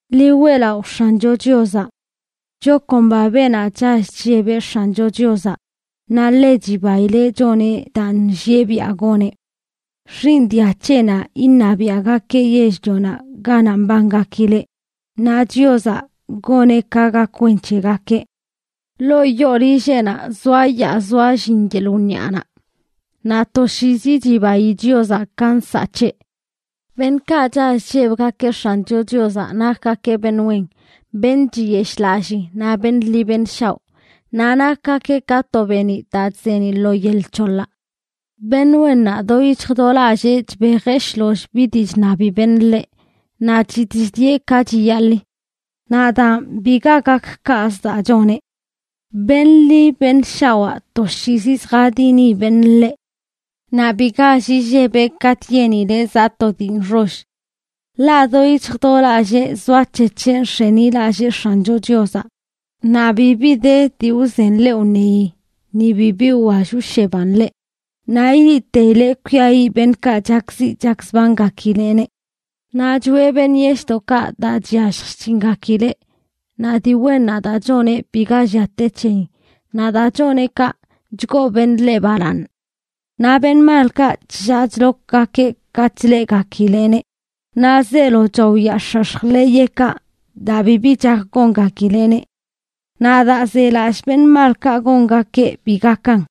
¡Ḻi weꞌlaꞌo X̱ancho Chiozaꞌ! Chakomba beenaꞌ chall chllebeꞌ X̱ancho Chiozaꞌ, naꞌ ḻe chibaileꞌ choneꞌ daa nllieꞌ biaꞌ goneꞌ. Xiiṉ dia c̱heꞌnaꞌ iṉabiaꞌgakeꞌ yell-lionaꞌ ganaꞌ mbangakileꞌ, naꞌ Chiozaꞌ goneꞌ ka gak wen c̱hegakeꞌ. Ḻoo yoo llilleꞌnaꞌ zoayaa zoallin yeḻꞌ wniaꞌnaꞌ, naꞌ toshiizi chibayi Chiozaꞌ ka nsaꞌ c̱heꞌ. Beṉꞌkaꞌ chall chllebgakeꞌ X̱ancho Chiozaꞌ nakgakeꞌ beṉ wen, beṉꞌ chiyeshꞌlallii naꞌ beṉꞌ ḻi beṉ shaoꞌ. Naꞌ nakgakeꞌ ka to beeniꞌ daa chzeeniꞌ lo yel c̱holaꞌ. Beṉꞌ wennaꞌ do yic̱hj do lallee chbejeꞌ shloll bi dii chṉabi beṉꞌ ḻeꞌ, naꞌ chitꞌ chdieꞌ ka chiyaḻi. Naꞌ daan, biga gak kaꞌzə daa choneꞌ. ¡Beṉꞌ ḻi beṉꞌ shawaa toshiizi lljadini beṉꞌ ḻeꞌ! Naꞌ bi gall illebeꞌ katꞌ yenileꞌ zaꞌ to dii nxoll; ḻaꞌ do yic̱hj do lallee zoac̱hec̱heꞌ nx̱enilallee X̱ancho Chiozaꞌ. Naꞌ bibi de dii wzen ḻeꞌ wṉeyi, ni bibi wwall wsheban ḻeꞌ, naꞌ ileꞌteileꞌ kwiayiꞌ beṉꞌkaꞌ chakziꞌ chakzbangakileꞌneꞌ. Naꞌ choꞌe beṉꞌ yeshꞌdoꞌkaꞌ daa chyallj chc̱hingakileꞌ, naꞌ dii wennaꞌ daa choneꞌ biga llia te c̱heyin. Naꞌ daa choneꞌ kaꞌ, chgoo beṉꞌ ḻeꞌ balaaṉ. Naꞌ beṉꞌ malkaꞌ chllaa chlokgakeꞌ katꞌ chleꞌgakileꞌneꞌ, naꞌ zeelo chaoyaax̱ax̱j ḻeyeꞌkaꞌ daa bibi chak gongakileꞌneꞌ. Naꞌ daa zelallꞌ beṉꞌ malkaꞌ gongakeꞌ bi gakan.